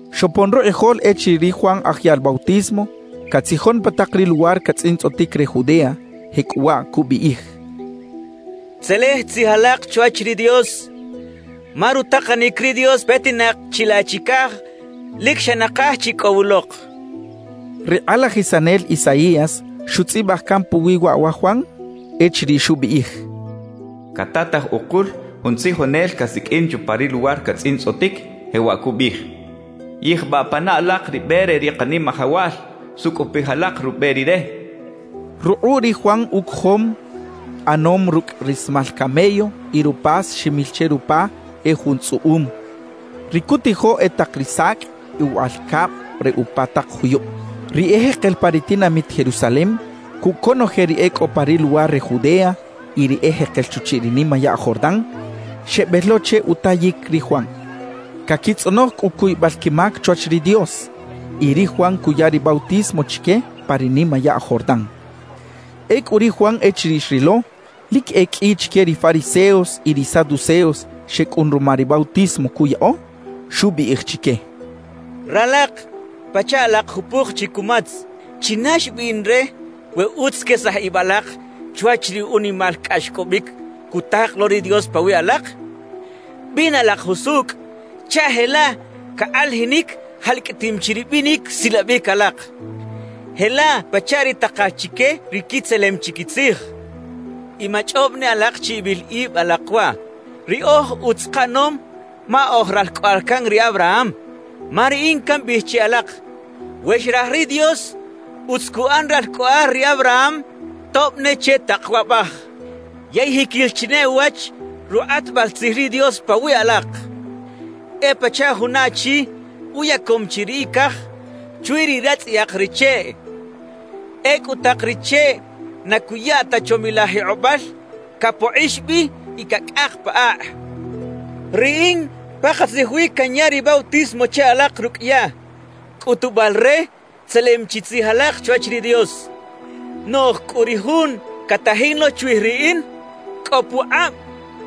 Xopon rukꞌijol echiriꞌ ri Juan Aj Yaꞌl Bautismo catzijon pa tak ri luwar catzꞌintzꞌotic re Judea. Jecꞌuwaꞌ cubiꞌij: «Tzelej tzij alak chwach ri Dios, ma rutakanic ri Dios petinak chilaꞌ chicaj lic xa nakaj chi cꞌo wulok» cachaꞌ. Ri kꞌalajisanel Isaías xutzꞌibaj can puwi waꞌ wa Juan echiriꞌ xubiꞌij: Catataj ukul jun tzijonel casiqꞌuin chupa ri luwar catzꞌintzꞌotic, jewaꞌ cubiꞌij: “Yijbaꞌ pana alak ri be re ri Kanimajawal; sucꞌupij alak rube Rire” xchaꞌ. Rukꞌuꞌ ri Juan ucojom ꞌanom rucꞌ rismal camello y rupas ximil che rupa e jun tzꞌuꞌum; ri cutijo e tak ri sacꞌ y uwaꞌal cab re upa tak juyub. Ri ejekel pa ri tinamit Jerusalem cucꞌ conoje ri e cꞌo pa ri luwar re Judea y ri ejekel chuchiꞌ ri nimayaꞌ Jordán, xebel lo che utayic ri Juan. Caquitzꞌonoj cꞌu cuybal quimac chwach ri Dios, y ri Juan cuya ri bautismo chique pa ri nimayaꞌ Jordán. Ecꞌu ri Juan echiriꞌ xrilo lic e qꞌui chique ri fariseos y ri saduceos xecꞌun ruma ri bautismo cuyaꞌo, xubiꞌij chique: «¡Ralak pachaꞌ alak jupuk chi cumatz! ¿China xbiꞌn re we utz quesaj ib alak chwach ri unimal cꞌaxcꞌobic cutak lo ri Dios pawiꞌ alak? Bina alak jusucꞌ chaꞌ jelaꞌ cakꞌalajinic jalcꞌatim chi ri binic silabic alak, jelaꞌ pachaꞌ ri takal chique ri quitzelem chi quitzij. »Y machꞌob ne alak chi ibil ib alak waꞌ: “Riꞌoj utz kaꞌanom, ma oj ralcꞌoꞌal can ri Abraham.” Ma riꞌin cambiꞌij che alak: We xraj ri Dios, utz cuꞌan ralcꞌoꞌal ri Abraham tob ne che tak waꞌbaj. Yey jiquil chi ne uwach rukꞌatbal tzij ri Dios pawiꞌ alak, e pachaꞌ juna achi uyacom chi ri icaj chwi ri ratzꞌayak ri cheꞌ; ecꞌu tak ri cheꞌ na cuya ta chomilaj jikꞌobal, capokꞌix bi y cacꞌak pa akꞌ. »Riꞌin pakatzij wi canya ri bautismo che alak rucꞌ yaꞌ, cꞌutubal re tzelem chi tzij alak chwach ri Dios. Noꞌj cꞌu ri Jun catajin lo chwij riꞌin, cꞌo pukꞌab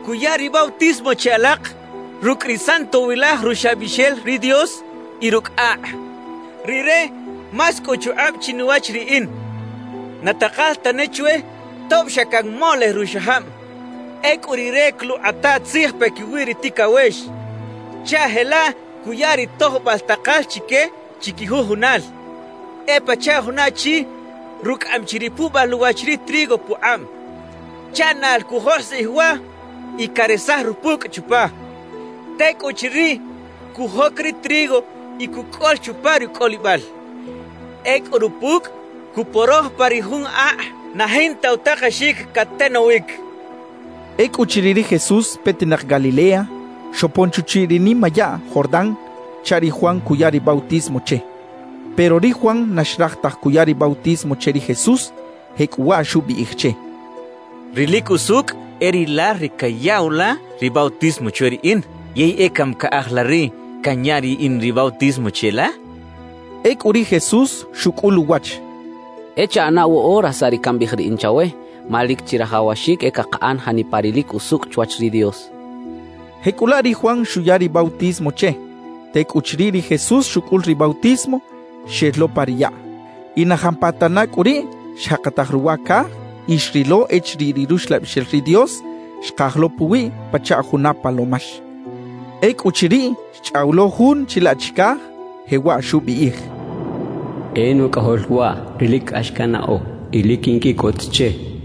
cuya ri bautismo che alak rucꞌ ri Santowilaj Ruxlabixel ri Dios y rucꞌ akꞌ. Rire más cꞌo uchukꞌab chinuwach riꞌin; na takal tane chwe tob xa canmolej ruxajab. Ecꞌu Rire coluꞌkꞌata tzij paquiwi ri ticawex chaꞌ jelaꞌ cuya ri tojbal takal chique chiquijujunal. E pachaꞌ juna achi rucꞌaꞌam chi ri puꞌbal uwach ri trigo pukꞌab chaꞌ naꞌl cujoskꞌij waꞌ y caresaj rupucꞌ chupa. Tecꞌuchiriꞌ, cujoc ri trigo y cucꞌol chupa rucꞌolibal. Ecꞌu rupucꞌ cuporoj pa ri jun akꞌ na jinta utakexic catenowic» xcha ri Juan. Ecꞌuchiriꞌ ri Jesús petinak Galilea, xopon chuchiꞌ ri nimayaꞌ Jordán chaꞌ ri Juan cuya ri bautismo che. Pero ri Juan na xraj taj cuya ri bautismo che ri Jesús, jecꞌuwaꞌ xubiꞌij che: —Ri lic usucꞌ e rilal ri cayaꞌw la ri bautismo chwe riꞌin. ¿Yey e cami caꞌaj la riꞌ canya riꞌin ri bautismo cheꞌla? —xchaꞌ. Ecꞌu ri Jesús xucꞌul uwach: —E chaꞌana woꞌora saꞌ ri cambiꞌij riꞌin chawe, ma lic chirajawaxic e cakaꞌan janipa ri lic usucꞌ chwach ri Dios —xchaꞌ. Jecꞌulaꞌ ri Juan xuya ri bautismo che. Tecꞌuchiriꞌ ri Jesús xucꞌul ri bautismo, xel lo pa ri yaꞌ. Y na jampatana cꞌu riꞌ xjakataj ruwa caj y xrilo echiriꞌ ri Ruxlabixel ri Dios xkaj lo puwiꞌ pachaꞌ juna palomax. Ecꞌuchiriꞌ, xchꞌaw lo Jun chilaꞌ chicaj, jewaꞌ xubiꞌij: «E Nucꞌajol waꞌ ri lic cꞌax cannaꞌo y lic quinquiꞌcot che» xcha ri Dios.